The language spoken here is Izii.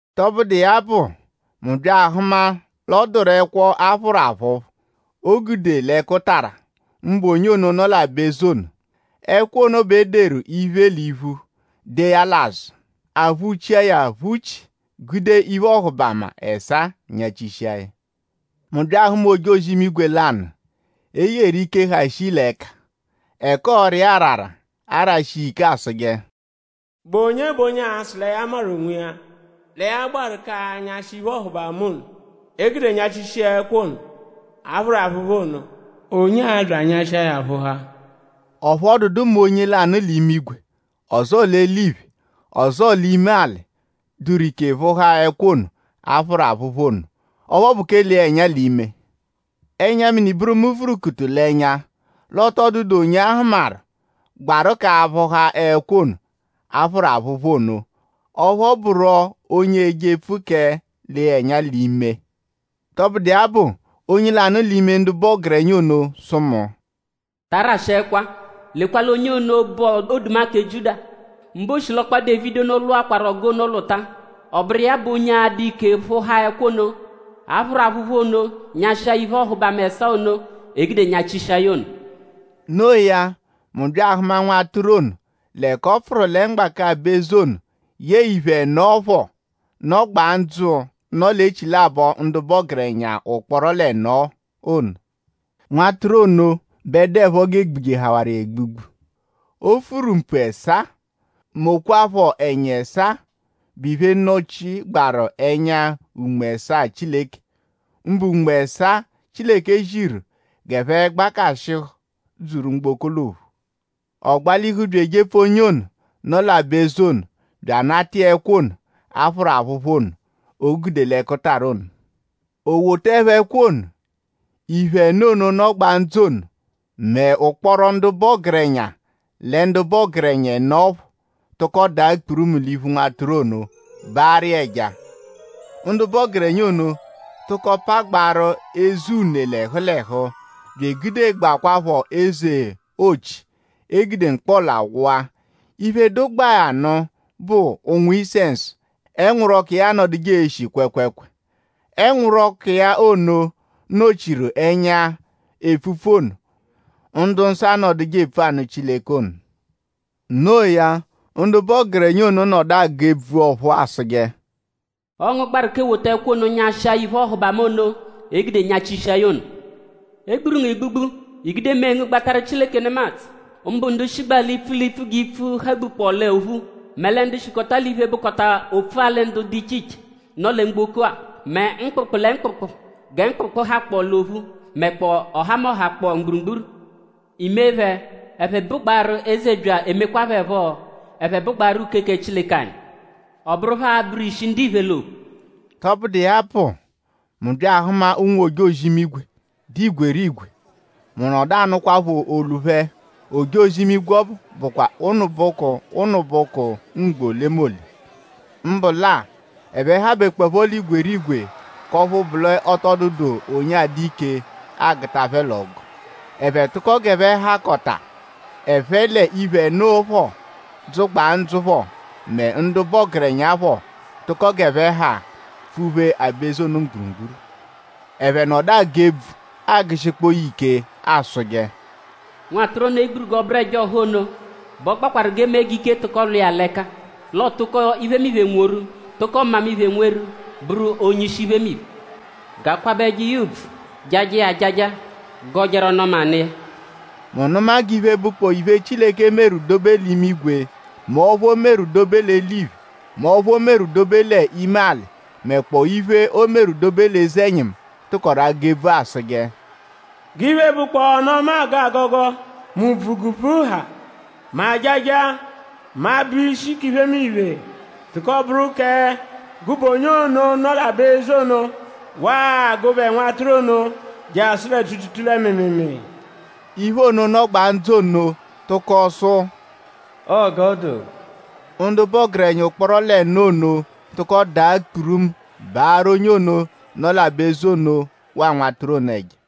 Tọbudu iya bụ; mu bya ahụma l'ọ dụru ẹkwo, a phụru aphụphu, o gude l'ẹkutara; mbụ onye ono, nọ l'aba-eze ono. Ẹkwo ono bẹ e deru iphe l'iphu; dee ya l'azụ. A phụ-chia ya aphụ-chi gude iphe-ọhubama ẹsaa nyachishia ya. Mu bya ahụma ojozi-imigwe lanụ, e yeru ike, ha shii l'ẹka; ẹka ọora iya arara arashi iya ike asụje: “?Bụ onye bụ onye a-sụ lẹ ya maru onwiya; lẹ ya gbaru k'anyashị iphe-ọhubama ono, e gude nyachishia ẹkwo ono, a phụru aphụphu ono;?onye a-bya anyashịa ya phụhaa?” Ọphu ọ dụdu mẹ onye lanụ l'imigwe; ọzoo l'eliphe; ọzoo l'ime-alị, dụru ike phụhaa ẹkwo ono, a phụru aphụphu ono; ọphu ọ bụ kẹ lee ya ẹnya l'ime. Ẹnya-mini bụru mu vurukutuku l'ẹnya l'ọ tọ dụdu onye a hụmaru, gbaru k'aphụha ẹkwo ono, a phụru aphụphu ono; ọphu ọ bụro onye eje epfu kẹ lee ya ẹnya l'ime. Tọbudu iya bụ; onye lanụ l'ime ndu bụ ọgerenya ono sụ mu: “Ta arashị ẹkwa! Lekwa l'onye ono, bụ Oduma kẹ Jiuda; mbụ oshilọkpa Dévidi ono lwụakwaru ọgu ono lwụta. Ọ bụru iya bụ onye a-dụ ike phụhaa ẹkwo ono, a phụru aphụphu ono nyashịa ya iphe-ọhubama ẹsaa ono, e gude nyachia ya ono.” No iya; mu bya ahụma Nwatụru ono l'ẹka ọ pfụru lẹ mgbaka aba-eze ono yẹe iphe ẹno phọ, nọgbaa ndzụ, nọ l'echilabọ ndu bụ ọgerenya ụkporo l'ẹno ono. Nwatụru ono bẹ dụepho g'e gbujehawaru iya egbugbu. O furu mpu ẹsaa; mokwaaphọ ẹnya ẹsaa, bụ iphe, nọ-chigbaaru ẹnya Unme ẹsaa Chileke; mbụ Unme ẹsaa, Chileke ziru g'ẹphe gbakashịhu dzuru mgboko l'ophu. Ọ gbalihu bya ejepfu onye ono, nọ l'aba-eze ono bya anata iya ẹkwo ono, a phụru aphụphu ono, o gude l'ẹkutara ono. O wotaẹpho ẹkwo ono; iphe ẹno ono, nọgbaa ndzụ ono mẹ ụkporo ndu bụ ọgerenya lẹ ndu bụ ọgerenya ẹno phọ tụko daa kpurumu l'iphu Nwatụru ono baarụ iya ẹja. Ndu bụ ọgerenya ono tụko pagbaarụ eze une l'ẹhu l'ẹhu bya egudegbakwaaphọ eze-ochi, e gude mkpọla wụa. Iphe dụgbaa ya nụ bụ ụ̀nwù-isẹnsu, ẹnwuru-ọku iya anọduje eshi kwẹekweekwee. Ẹnwuru-ọku iya ono nọ-chiru ẹnya epfupfu ono, ndu-nsọ anọduje epfu anụ Chileke ono. No iya; ndu bụ ọgerenya ono nọdu agụ ebvu ọ̀phúú asụje: “Ọo ngu gbaru k'ewota ẹkwo ono; nyịshia ya iphe-ọhubama ono, e gude nyachishia ya ono. E gburu ngu egbugbu; I gude mee ngu gbatarụ Chileke nemadzụ; mbụ ndu shigba l'ipfu l'ipfu g'ipfu hagbukpọ l'ophu; mẹ lẹ ndu shikọta l'iphe, bụkota opfu-alị ndu dụ iche iche, nọ lẹ mgboko-a; mẹ mkpụkpu lẹ mkpụkpu gẹ mkpụkpu hakpọo l'ophu; mẹkpoo ọhamoha kpọ mgburugburu. I mee phẹ: ẹphe bụgbaaru eze bya emekwaa phẹ phọ: ẹphe bụgbaaru uke kẹ Chileke anyi. Ọ bụru phẹ a-bụru ishi ndiphe l'ophu.” Tọbudu iya bụ; mu bya ahụma ụnwu-ojozi-imigwe, dụ igwerigwe. Mu nọdu anụkwapho olu phẹ. Ojozi-imigwe ọbu bụkwa ụnubuku ụnubuku ugbo olemole; mbụ lẹ-a; ẹphe habekpọepho l'igwerigwe; k'ọphu bụ l'ọ tọ dụdu onye adụ ike agụta phẹ l'ọgu. Ẹphe tụko g'ẹphe hakọta; ẹphe l'iphe ẹno phọ, dzụgbaa ndzụ phọ; mẹ ndu bụ ọgerenya phọ; tụko g'ẹphe ha pfuphee aba-eze ono mgburugburu. Ẹphe nọdu agụ ebvu agụshikpoo ya ike asụje: “Nwatụru ono, e gburu g'ọ bụru ẹja ọha ono bẹ ọ gbakwarụ g'e mee g'ike tụko lwa iya l'ẹka; l'ọo tụko iphemiphe nworu; tụko mmamiphe nweru; bụru onye-ishi iphemiphe. G'a kwabẹje iya ùbvù; jajẹ iya ajaja; gọjeru ọnu-ọma nụ iya.” Mu nụma g'iphe, bụkpoo iphe, Chileke meru dobe l'imigwe; mẹ ọphu, o meru dobe l'eliphe; mẹ ọphu o meru dobe l'ime-alị; mẹkpoo iphe, o meru dobe l'eze-ẹnyimu; tụkoru agụ ebvu asụje: “G'iphe, bụkpoo ọnu-ọma, aagọ agọgo; mẹ ùbvù g'ùbvù ha; mẹ ajaja; mẹ abụ ishi k'iphemiphe tụko bụru kẹ gụbe onye ono, nọ l'aba-eze ono waa gụbe Nwatụru ono jasụ lẹ tuutuutuu lẹ mịimiimii.” Iphe ẹno ono, nọgbaa ndzụ ono tụko sụ: “Ọo g'ọ dụ.” Ndu bụ ọgerenya ụkporo l'ẹno ono tụko daa kpurumu baarụ onye ono, nọ l'aba-eze ono waa Nwatụru ono ẹja.